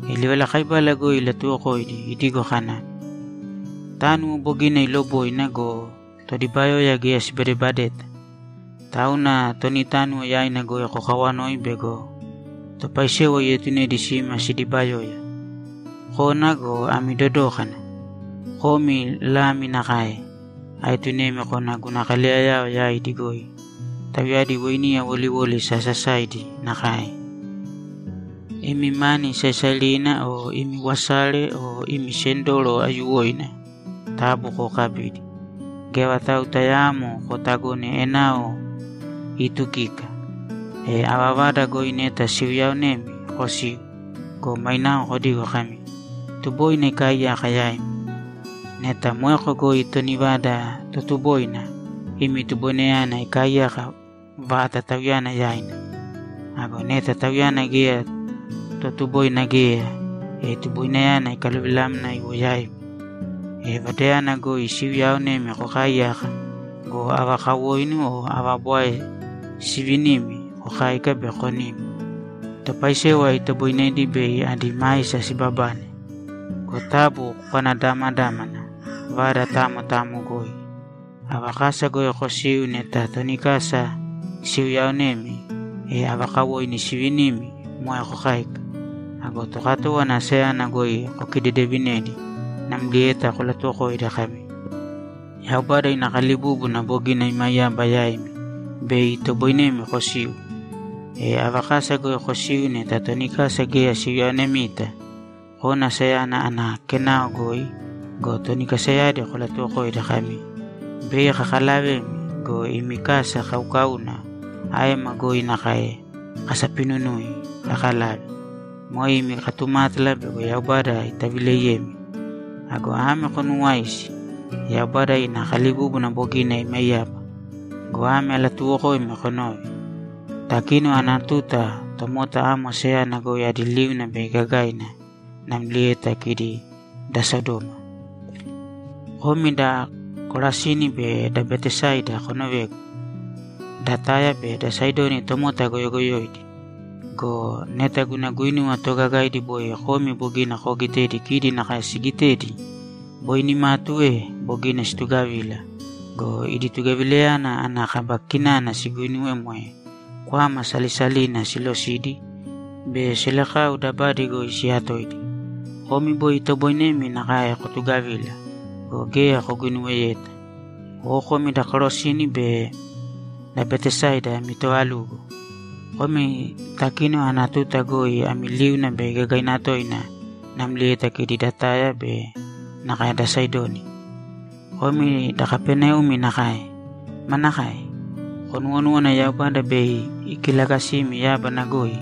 E livalakaibala goi ilatuwokoidi idigo kana, ‘Tánuwo bogina iloboina go, todibayoya geya sibadebadeta. Tauna toni tánuwo yaina goi kokawanōi bego topaisewa ietunedi sima sidibayoya. Kōna go, ami dodōkana! Komi lami nakae aetunemi kona guna kaleyayao yaidi goi; tauyadi weiniya woliwoli sasasaidi nakae. Imi mani saisairina o imi wasare o imi sendoro aiyuwoina taabu kookabīdi. Geya vatau tayaamo kootagōne enao iitukika. E ava vada goi neta siuyaonemi, kosīu go, mainao kodīgo kami, “Tuboina ikaaiyaka yaimi.” Neta moeko goi toni vada totuboina, imi tuboinayana ikaaiyako vata tauyana yaina. Ago neta tauyana geya totuboina geya, e tuboinayana ikaluvilamna iwo yaimi. E vadayana goi siuyaaonemi kokaaiyāka go, ava kawoinu o ava bwae siivinimi, kokāika be konīm. Topaisewa itoboinedi bei adi maisa sibabane. Go taabu kokanadamadāmana vada tayamo tayamo goi. Ava kasa goi kosiu neta toni kasa siuyaonemi, e ava kawoinu siivinimi, moe kokāika. Ago tokatówana asayana goi kokidedevinēdi namlieta kolatuwokōidi kami, “Yaubada ina kalibúbuna bogina imaiyaba yaimi bei itoboinemi kosiu.” E ava kasa goi kosiu neta toni kasa geya siuyaonemita, kōna asayana ana kenao goi go, toni kasayadi kolatuwokōidi kami, “Bei kakalavemi go, imi kasa kaukauna aema goi nakae kasapinunui kakalave. Moe imi katumátala bego Yaubada itavileiyemi. Ago ame konuuwāisi: Yaubada ina kalibúbuna bogina imaiyaba.” Go ame alatuuwokoimi konōve: Takínona ana tuta tomota amo asayana goi adi liuna bei gagaina namlieta kidi da Sodoma. Komi da Korasini be da Betesaida konovēgu! Da Taya be da Saidoni tomota goyogoyoidi. Go neta guna guinuwa toogagaidi boi komi bogina koogitedi kidi nakae sigitedi, boi nimatu e bogina situgavila go, idi tugavilayana ana kaba kinana siguinuwe moe kwama salisalina silosidi be selekau dabadi goi siyatoidi. Komi boi itoboinemi nakae kotugavila go, geya koguinuweyeta. O komi da Korasini be da Betesaida ami toovalugo! Komi takínona ana tuta goi ami liuna bei gagaina toina namlieta kidi da Taya be nakae da Saidoni. Komi da Kapaneumi nakae. Manakae? Konuwonúwana Yaubada bei ikilagasimi yábana goi?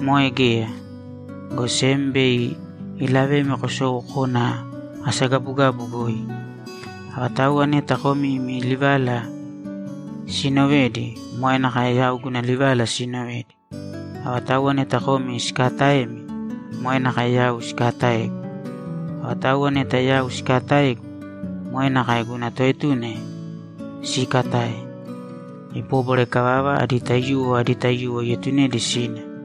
Moe geya, go sem bei ilavemi kosou kona asagabugabu goi! Avatauwa neta komi imi livala siinovedi, moe nakae yau guna livala siinovedi. Avatauwa neta komi sikaataemi, moe nakae yau sikaataegu. E avatauwa neta yau sikaataegu, moe nakae guna toetuna siikatae.’ Ibóbwara ikavava, adi taiyuwo adi taiyuwo ietunedi sina.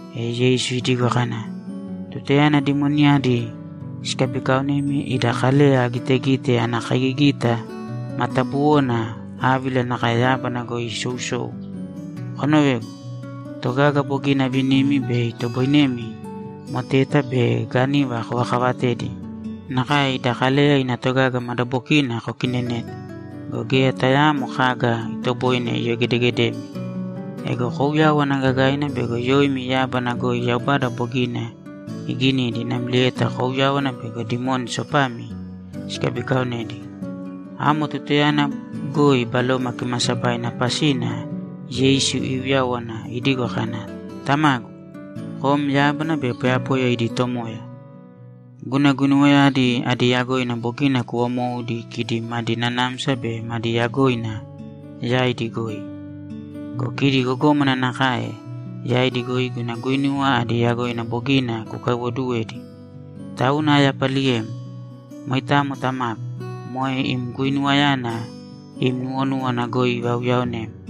E Yeisu idigo kana, ‘Tutayana dimoniyadi sikabikaonemi ida Kaleya agitegite ana kaigigita matabuwona ávila nakae yábana goi isousou. Konovēgu. Togaga bogina avinimi be itoboinemi moteta be gániva kovakavatedi nakae ida Kaleya ina togaga madabokina kokinenete go, geya tayaamo kaga itoboine iyogedegedemi. Ego kouyāwana gagaina bego yoimi yábana goi Yaubada bogina iginidi namlieta kouyāwana bego dimoni sopami sikabikaonedi.’ Amo tutayana goi Baloma Kimaasabaina pasina Yeisu iuyáwana idigo kana, ‘Tamagu, kom yábana be poyapoya idi Tomoya. Guna guinuwayadi adi yagoina bogina kuvamoudi kidi madi nanamsa be madi yagoina yaidi goi go, kidi gogómana nakae yaidi goi guna guinuwa adi yagoina bogina kukaiwoduwedi. Tauna ayapaliyem. Moitamo Tamagu, moe im guinuwayana im nuwonúwana goi ivauyaonem.’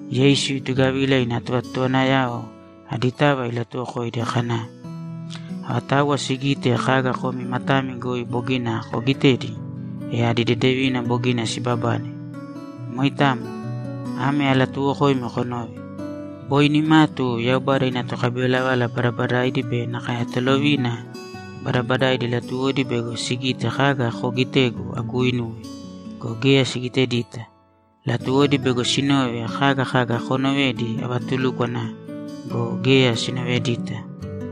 Yeisu itugavila ina tovatotowanayao aditava ilatuwokoidi kana, ‘Avatauwa sigite kaga komi matami goi bogina koogitedi, e adi dedevina bogina sibabane. Moitamo. Ame alatuuwokoimi konōve: Boi nimatu Yaubada ina tokabivalavala badabadaidi be nakae tolovina badabadaidi latuwodi bego sigite kaga koogitegu aguuinuwe go, geya sigitedita. Latuwodi bego sinove kaga kaga koonovedi avatulúkwana go, geya sinovedita.’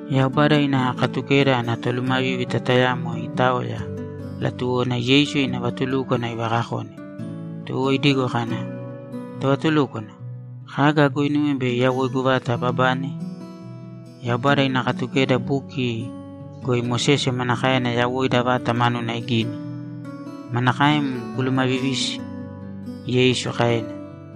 Yaubada ina Katukeda ana tolumavívita tayamo itaoya; latuwona Yeisu ina vatulúkwana ivakakone. Tuwo idigo kana, ‘Tovatulúkwana, kaga aguuinuwe bei yawoigu vata ababane?’ ‘Yaubada ina Katukeda buki goi Mosese manakaena yawoida vata manuna igini? Manakaem kulumavivisi?’ Yeisu kaena.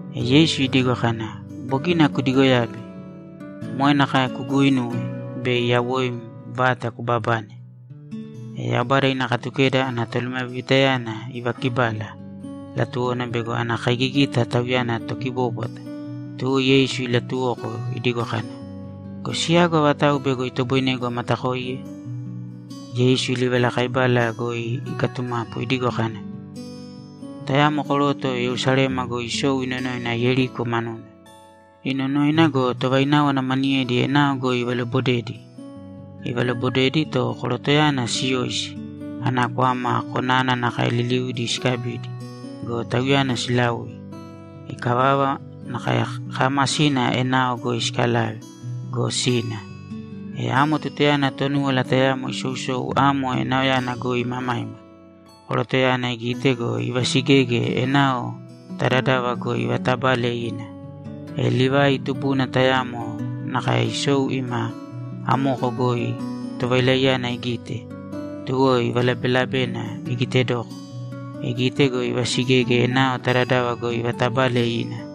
E Yeisu idigo kana, ‘Bogina kudigoyabe. Moe nakae kuuguinūwe, bei yawoim vata kubabane.’ E Yaubada ina Katukeda ana tolumavivitayana ivakibala; latuwona bego ana kaigigita tauyana tokibóbwata, tuwo Yeisu ilatuwoko idigo kana, ‘Go siyagu avatau bego itoboinegu amatakoiye?’ Yeisu livalakaibala goi ikatumapu idigo kana, ‘Tayamo koroto Yerusalema goi isou inonoina Yeriko manuna. Inonoina go, tovaináwana maniyedi enao goi ivalobodedi. Ivalobodedi, to korotoyana siyoisi, ana kwama, konana nakae liliudi sikabidi go, tauyana silaui. Ikavava, nakae kaamasina enao goi sikalave go, sina. E amo tutayana Tonúwala tayamo isousou amo enaoyana goi imamaima, korotoyana igite go, ivasigege enao ta dadava goi ivatabale ina. E Livai tubuna tayamo nakae isou ima amoko goi tovailaiyana igite, tuwo ivalabelabena igitedoko. Igite go, ivasigege enao ta dadava goi ivatabale ina.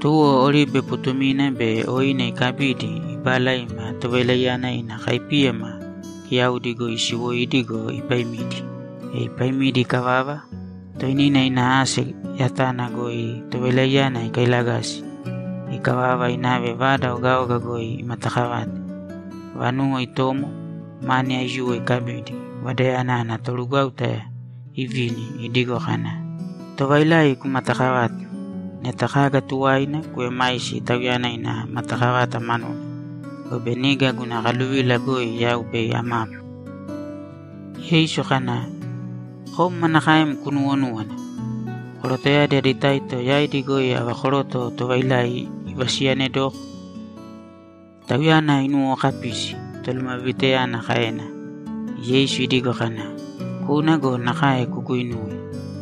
Tuwo oribe putumina be oine ikabidi, ibala ima tovailaiyana ina kaipíyama kiyaudi goi isiwoidi go, ipaimidi. E ipaimidi ikavava, toinina ina ase yatana goi tovailaiyana ikailagasi. Ikavava, inave vada ogaoga goi imatakavate. Vanuwo itomo, mani aiyuwo ikabidi, vadayana ana torugwáuta ivini idigo kana, “Tovailai kumatakavāte. Neta kaga tuwaina kuemaisi tauyana ina matakavata manuna, gobe niga guna kaluvila goi yau bei amapu.”’ Yeisu kana, ‘Kom manakaem kunuwonúwana? Korotoyadi adi taito yaidi goi ava koroto tovailai ivasiyanedoko?’ ‘Tauyana inuwookapisi’, tolumavivitayana kaena. E Yeisu idigo kana, ‘Kūna go, nakae kuguinūwe.’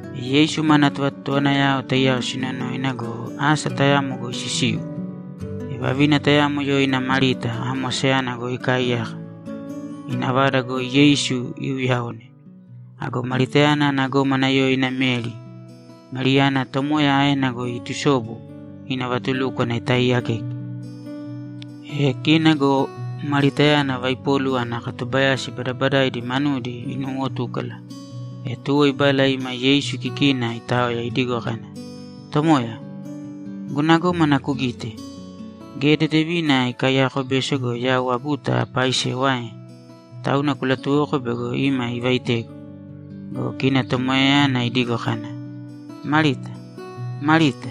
E Yeisu mana tovatotowanayao taiyao sinonoina go, asa tayamo goi sisiu. E vavina tayamo yoina Marita amo asayana goi ikaaiyaka, ina vada goi Yeisu iuyaone. Ago Maritayana ana gómana yoina Meri. Meriyana Tomoya aena goi iitusobu, ina vatulúkwana itaaiyakeke. E kina go Maritayana vaipolu ana katubayasi badabadaidi manudi inuuwotúkala. E tuwo ibala ima Yeisu kikina itaoya idigo kana, ‘Tomoya, guna gómana kugite? Geya dedevina ikaiyako beso go, yau aguta apaaisewa ae? Tauna kulatuwōko bego ima ivaitegu.’ Go kina Tomoyayana idigo kana, ‘Marita, Marita,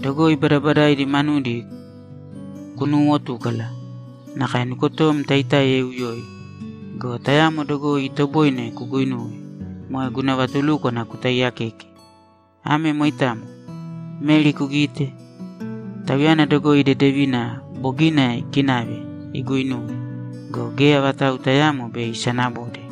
dogoi badabadaidi manudi kunuuwotúkala, nakae nukotom taitáiya iuyoi. Go tayamo dogoi itoboine kuguinuwe, moe guna vatulúkwana kutaiyakeke. Ame moitamo. Meri kugite? Tauyana dogoi dedevina bogina ikinave iguuinuwe go, geya vatau tayaamo bei isanabode.’